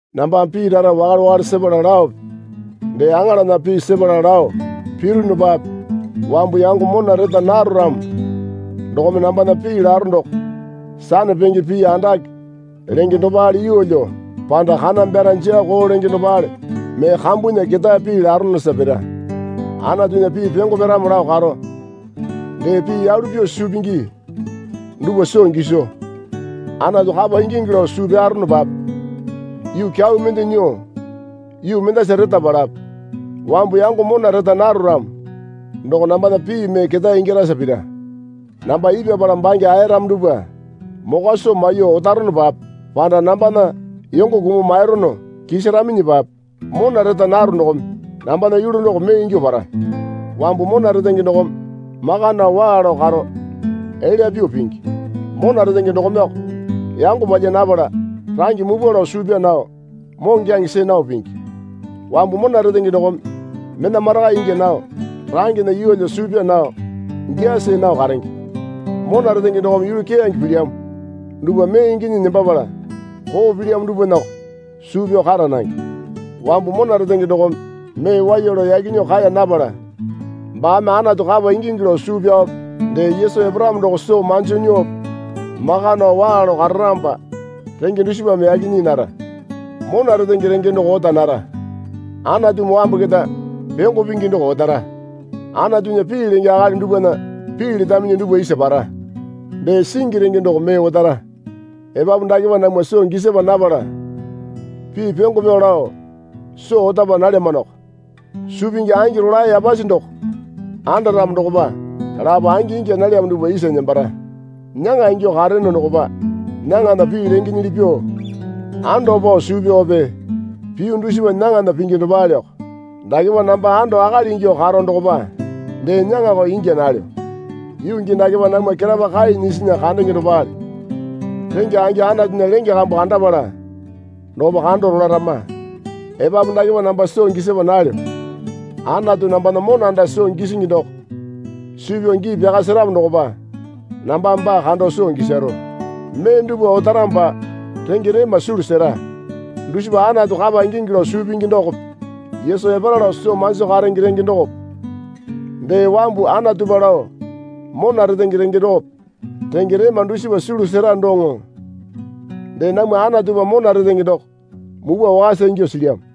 Nambame pii rara wakale wakale sepala laope dee aŋalana pii sepala lao pirunupape wambu yango mona reta naro ramo dokome nambana pii laro doko sanapenge pii andake lenge dopale yeelyo panda kana byara jaa koo lenge dopale mee kambunya ketae pii laronosa pira. Anatunya pii pyongo pyaramo lao karo dee pii yalu pyuo suu pingi dupwa soo giso Anatu kapa ingingi lao suu pyaronopape yuu kyau mende nyuo yuu mendasa retapalape wambu yango mona reta naro ramo doko nambana pii mee ketae ingyarasa pira. Namba ipyapala bange aeyaramo dupwa mokwa soo maiyuo otaronapape panda nambana yongo kumuo mairono kisaraminyipape mona reta naro dokome nambana yulu doko mee ingyuo para. Wambu mona retenge dokome maka nao waa lao karo elya pyuo pingi. Mona retenge dokomeko yango palya napala range mupwa lao suu pyaa nao moŋokyaŋe see nao pingi. Wambu mona retenge dokome mena marakai ingya nao rangena yeelyo suu pyaa nao gyaa see nao karenge. Mona retenge dokome yulu keyange pilyamo dupwa mee inginyi nembapala koo pilyamo dupwanako suu pyao kara nange. Wambu mona retenge dokome mee waiya lao yaki nyuo kae napala baame Anatu kapa ingingi lao suu pyaope dee Yesu eparamo doko soo manji nyuope maka nao waa lao kararamopa renge dusipame yaki nyii nara. Mona retenge renge doko ota nara. Anatumi wambu keta pyongo pingi doko otara. Anatunya pii lenge akali dupwana pii letaminyi dupwa isa para. Dee singi renge doko mee otara. Epapu dakepa namwa soo gisapa napala pii pyongo pyao lao soo otapa nalyamanoko. Suu pingi angi rolae yapasi doko andaramo dokopa lapo angi ingya nalyamo dupwa isa nembara. Nyaŋa ingyuo kareyono dokopa nyaŋana pii lengenyili pyuo ando pao suu pyaope piyu dusipa nyaŋana pingi dopaleoko. Dakepa namba anda akali ingyuo karo dokopa dee nyaŋako ingya nalyo. Yuu gii dakepa namwa ketapa kai nyisinya kandenge dopale. Rengya angi Anatunya lenge kambu kandapala dokopa kando rolarama. Epapu dakepa namba soo gisapa nalyo. Anatu nambana mona anda soo gisingi doko suu pyao gii pyaka seramo dokopa nambame baa kando soo gisaro. Mee dupwa otaramopa renge rema sulu sera. Dusipa Anatu kapa ingingi lao suu pingi dokope Yesu epara lao soo manjo karenge renge dokope dee wambu Anatupa lao mona retenge renge dokope. Renge rema dusipa sulu sera doŋo dee namwa Anatupa mona retenge doko mupwa wakasa ingyuo silyamo.